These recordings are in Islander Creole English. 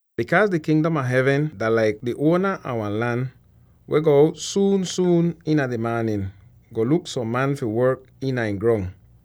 “Bikaaz di Kingdom a Hevn dah laik di uona a wan lan weh go out suun-suun iina di maanin, go luk som man fi work iina ihn grong.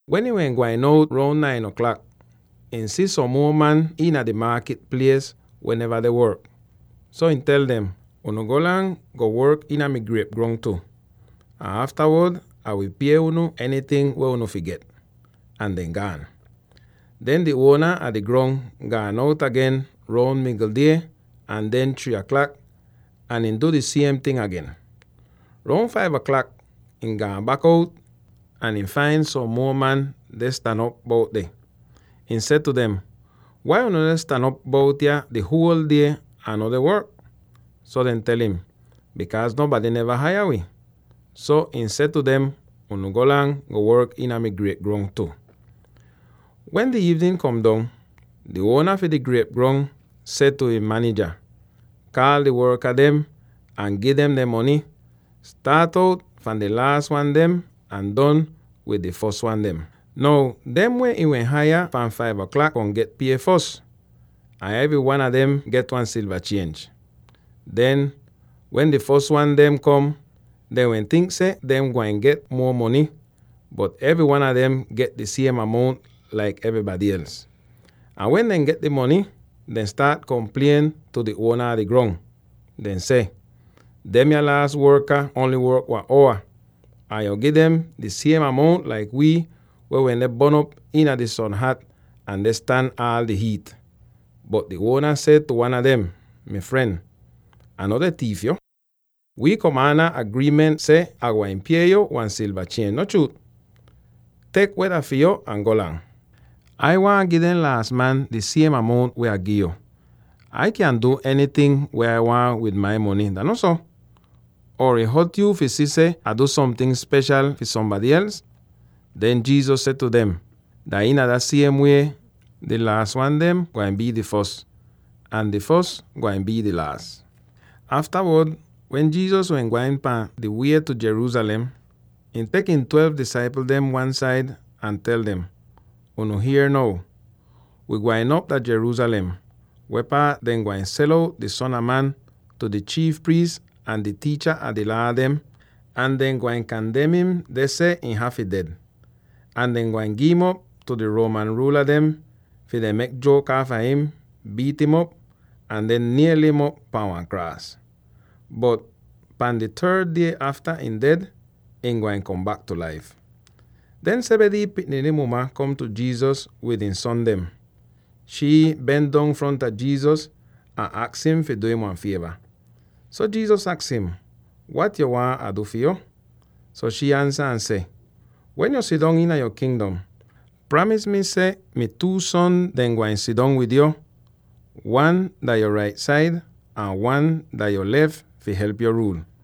Wen ihn wehn gwain out roun nine aklak, ihn si som muo man iina di maakit plies weh neva deh work. So ihn tel dem, ‘Unu golang, go work iina mi griep grong tu, ahn aftawod Ah wi pie unu enyting weh unu fi get.’ Ahn dehn gaan. Den di uona a di grong gaan out agen roun migl die ahn den three aklak, ahn ihn du di siem ting agen. Roun five aklak, ihn gaan bak out ahn ihn fain som muo man deh stan op bout deh. Ihn seh tu dem, ‘Wai unu deh stan op bout yah di huol die ahn no deh work?’ So dehn tel im, ‘Bikaaz nonbady neva haya wi.’ So ihn seh tu dem, ‘Unu golang, go work iina mi griep grong tu.’ “Wen di iivnin kom dong, di uona fi di griep grong seh tu ihn manija, ‘Kaal di worka dem ahn gi dem dehn mony, staat out fahn di laas wan dem ahn don wid di fos wan dem.’ Now, dem weh ihn wehn haya fahn five aklak kom get pie fos, ahn evry wan a dem get wan silva chienj. Den, wen di fos wan dem kom, dehn wehn tink seh dehn wehn gwain get muo mony, bot evry wan a dem get di siem amount laik evrybady els. Ahn wen dehn get di mony, dehn staat komplien tu di uona a di grong, deh seh, ‘Demya laas worka ongl work wan owa, ahn yo gi dem di siem amount laik wii weh wende bon'op iina di sonhat ahn deh stan aal di hiit!’ Bot di uona seh tu wan a dem, ‘Mi fren, Ah no deh tiif yo. Wi kom aanda agriiment seh Ah gwain pie yo wan silva chienj, no chruut? Tek weh dah fi yo, ahn golang! Ai waahn gi dem laas man di siem amount weh Ah gi'yo. Ai kyan du enyting weh Ah waahn wid mi mony, dah no so? Or ih hot yo fi si seh Ah du somting speshal fi sombady els?’” Den Jesus seh tu dem, “Dah iina dah siem wie, di laas wan dem gwain bii di fos, ahn di fos gwain bii di laas.” Aftawod, wen Jesus wehn gwain pahn di wie tu Jerusalem, ihn tek ihn twelve disaipl dem wan-said ahn tel dem, “Unu hier now; wi gwain op dah Jerusalem, weh paat dehn gwain sel out di Son a Man tu di chiif priis ahn di tiicha a di Laa dem, ahn dehn gwain kandem im deh seh ihn hafy ded. Ahn dehn gwain gi'im op tu di Roman ruula dem Or: “…tu di Gentile pipl dem.” fi dehn mek juok aafa im, biit'im op, ahn den niel'im op pahn wan kraas. Bot pahn di third die afta ihn ded, ihn gwain kom bak tu laif.” Den Zebedee pikniny muma kom tu Jesus wid ihn son dem. Shii ben dong fronta Jesus ahn aks im fi du im wan fieva. So Jesus aks im, “Wat yo waahn Ah du fi yo?” So shii ansa ahn seh, “Wen yu sidong iina yo Kingdom, pramis mi seh mi two son dehn gwain sidong wid yo, wan dah yo rait said ahn wan dah yo lef fi help yu ruul.”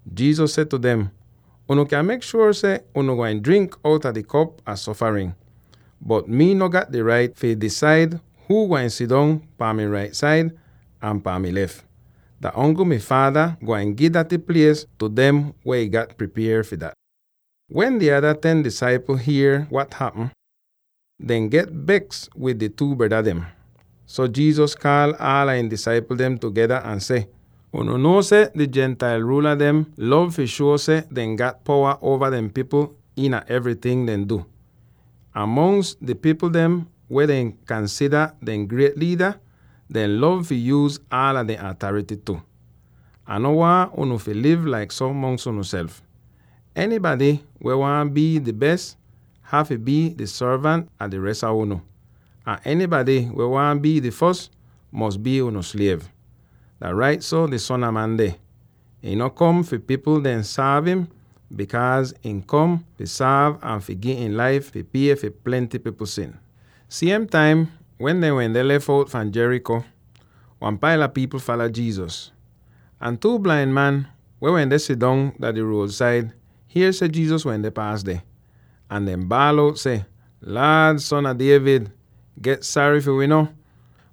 Jesus seh tu dem, “Unu kyan mek shuor seh unu gwain drink outa mi kop a sofarin. Bot mii no gat di rait fi disaid huu gwain sidong pahn mi rait said, or pan mi lef. Dah ongl mi Faada gwain gi daty plies tu dem weh ihn gat pripier fi dat.” Wen di ada ten disaipl hier weh hapm, dehn get beks wid di two breda dem. So Jesus kaal aala ihn disaipl dem tugeda ahn seh, “Unu nuo seh di Gentile ruula dem lov fi shuo seh dehn gat powa uova dehn pipl iina evryting dehn du, ahn mongs di pipl dem weh dehn kansida dehn griet liida, dehn lov fi yuuz aala dehn atarity tu. Ah no waahn unu fi liv laik so mongs unuself. Enybady weh waahn bii di bes, hafy bii di sorvant a di res a unu; ahn enybady weh waahn bii di fos, fi bii unu sliev. Dah rait so di Son a Man deh; ihn no kom fi di pipl dehn sorv im, bikaaz him kom fi sorv ahn fi gi ihn laif fi pie fi plenty pipl sin.” Siem taim wen dehn wende lef out fahn Jericho, wan paila pipl fala Jesus. Ahn two blain man weh wende sidong dah di ruod-said hier seh Jesus wende paas deh, ahn dehn baal out seh, “Laad, Son a David, get sary fi wi no!”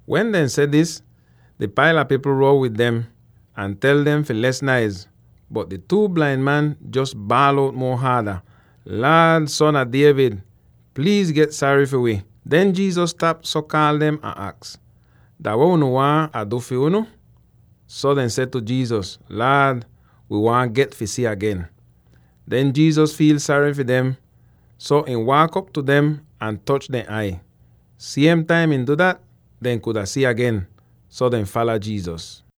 Wen dehn seh dis, di paila pipl row wid dem, ahn tel dem fi les naiz, bot di two blain man jos baal out muo haada, “Laad, Son a David, pliiz get sary fi wi!” Den Jesus stap, so kaal dem, ahn aks, “Dah weh unu waahn Ah du fi unu?” So dehn seh tu Jesus, “Laad, wi waahn get fi si agen!” Den Jesus fiil sary fi dem, so ihn waak op tu dem ahn toch dehn ai. Siem taim ihn du dat, dehn kuda si agen! So dehn fala Jesus.